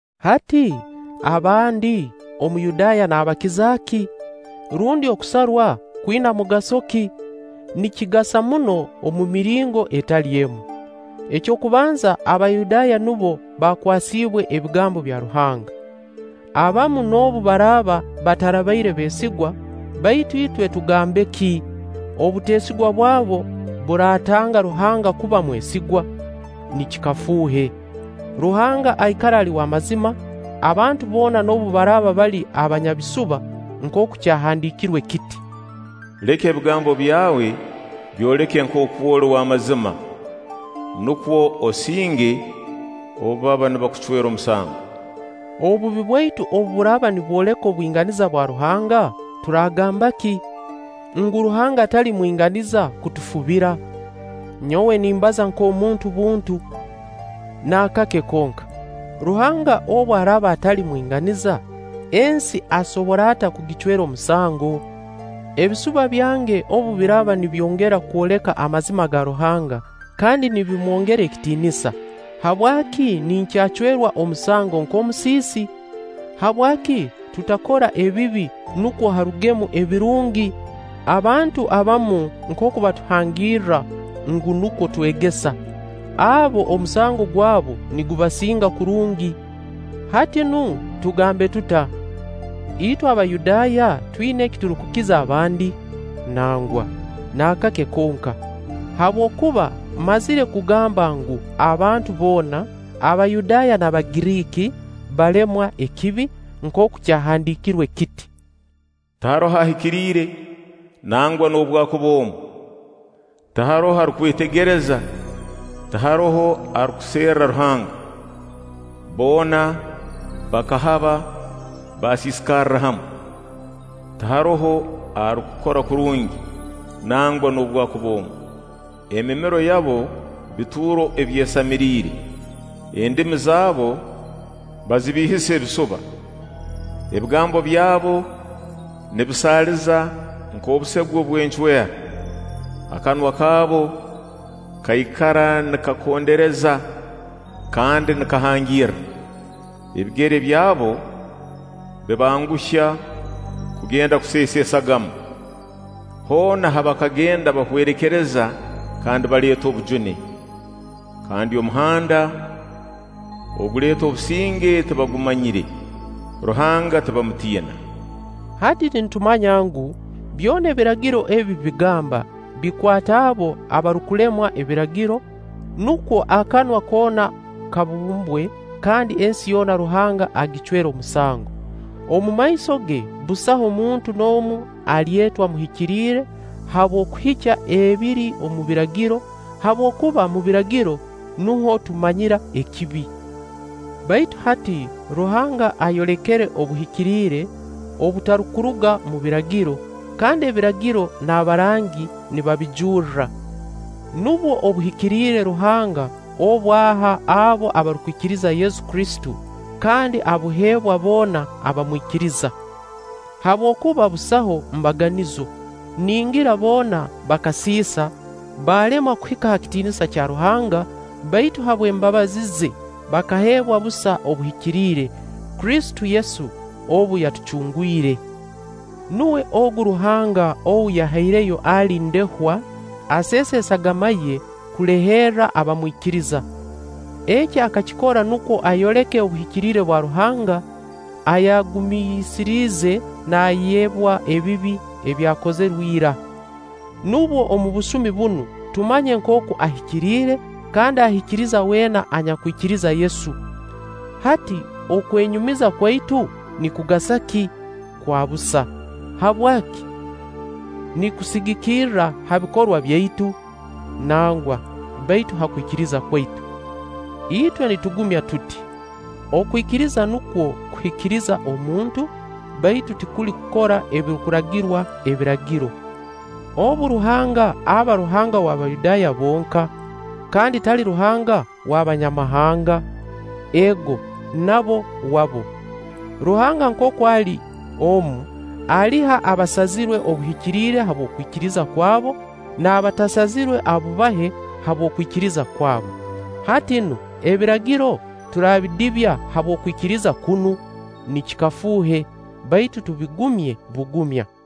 Hati abandi Omuyudaaya naabakiza ki? Rundi okusarwa kwina mugaso ki? Nikigasa muno omu miringo etali emu. Eky'okubanza Abayudaaya nubo baakwasiibwe ebigambo bya Ruhanga. Abamu noobu baraaba batarabaire beesigwa, baitu itwe tugambe ki? Obuteesigwa bwabo buratanga Ruhanga kuba mwesigwa? Nikikafuuhe! Ruhanga aikara ali w'amazima abantu boona noobu baraaba bali banyabisuba, nkooku kyahandiikirwe kiti: “Leka ebigambo byawe byoleke nkooku oli w'amazima, nukwo osinge obu baba nibakucwera omusango.” Obubi bwaitu obu buraaba nibwoleka obwinganiza bwa Ruhanga, turagamba ki? Ngu Ruhanga tali mwinganiza kutufubira? [Nyowe nimbaza nk'omuntu buntu.] Naakake konka! Ruhanga obu araaba atali mwinganiza, ensi asobora ata kugicwera omusango? Ebisuba byange obu biraaba nibyongera kwoleka amazima ga Ruhanga kandi nibimwongera ekitiinisa, habwaki ninkyacwerwa omusango nk'omusiisi? Habwaki tutakora ebibi nukwo harugemu ebirungi? - abantu abamu nkooku batuhangirra ngu, nukwo twegesa. Abo, omusango gwabo nigubasinga kurungi. Hati nu tugambe tuta? Itwe Abayudaaya twina eki turukukiza abandi? Nangwa, naakake konka; habwokuba mmazire kugamba ngu, abantu boona, Abayudaaya n'Abagiriiki, balemwa ekibi, nkooku kyahandiikirwe kiti: “Tiharoho ahikiriire, nangwa noobwakuba omu; tiharoho arukwetegereza, tiharoho arukuserra Ruhanga. Boona bakahaba, baasiisikarra hamu, tiharoho arukukora kurungi, nangwa noobwakuba omu.” “Emimiro yabo bituuro ebyesamiriire, endimi zabu bazibiihisa ebisuba.” “Ebigambo byabo nibisaaliza nk'obusegwe bw'encwera.” “Akanwa kaabo kaikara nikakondereza kandi nikahangirra.” “Ebigere byabo bibanguhya kugenda okuseesa esagama, hoona ha bakagenda bahwerekereza kandi baleeta obujune, kandi omuhanda oguleeta obusinge tibagumanyire.” “Ruhanga tibamutiina.” Hati nitumanya ngu, byona Ebiragiro ebi bigamba, bikwata abo abarukulemwa Ebiragiro, nukwo akanwa koona kabumbwe kandi ensi yoona Ruhanga agicwere omusango. Omumaiso ge busaho muntu n'omu alyeetwa muhikiriire habw'okuhikya ebiri omu Biragiro; habwokuba omu Biragiro nuho tumanyira ekibi. Baitu hati Ruhanga ayolekere obuhikiriire obutarukuruga omu Biragiro, kandi Ebiragiro n'abarangi nibabijurra. Nubwo obuhikiriire Ruhanga obu aha abo abarukwikiriza Yesu Kristo, kandi obuheebwa boona abamwikiriza. Habwokuba busaho mbaganizo: ningira boona bakasiisa, balemwa kuhika ha kitiinisa kya Ruhanga, baitu habw'embabazi ze bakaheerwa busa obuhikiriire, Kristo Yesu obu yatucungwire. Nuwe ogu Ruhanga ou yahaireyo ali ndehwa, aseese esagama ye kuleherra abamwikiriza. Eki akakikora nukwo ayoleke obuhikiriire bwa Ruhanga, ayagumiisirize naayebwa ebibi ebyakozirwe ira; nukwo omu busumi bunu tumanye nkooku ahikiriire, kandi ahikiriza weena anyakwikiriza Yesu. Hati okwenyumiza kwaitu nikugasa ki? Kwa busa. Habwaki? Nikusigikira ha bikorwa byaitu? Nangwa, baitu ha kwikiriza kwaitu. Itwe nitugumya tuti: Okwikiriza nukwo kuhikiriza omuntu, baitu tikuli kukora ebirukuragirwa Ebiragiro. Obu, Ruhanga aba Ruhanga w'Abayudaaya bonka? Kandi tali Ruhanga w'Abanyamahanga? Ego, nabo wabo. Ruhanga nkooku ali omu, aliha abasazirwe obuhikiriire habw'okwikiriza kwabo, n'abatasazirwe abubahe habw'okwikiriza kwabo. Hati nu Ebiragiro turabidibya habw'okwikiriza kunu? Nikikafuuhe! Baitu tubigumye bugumya.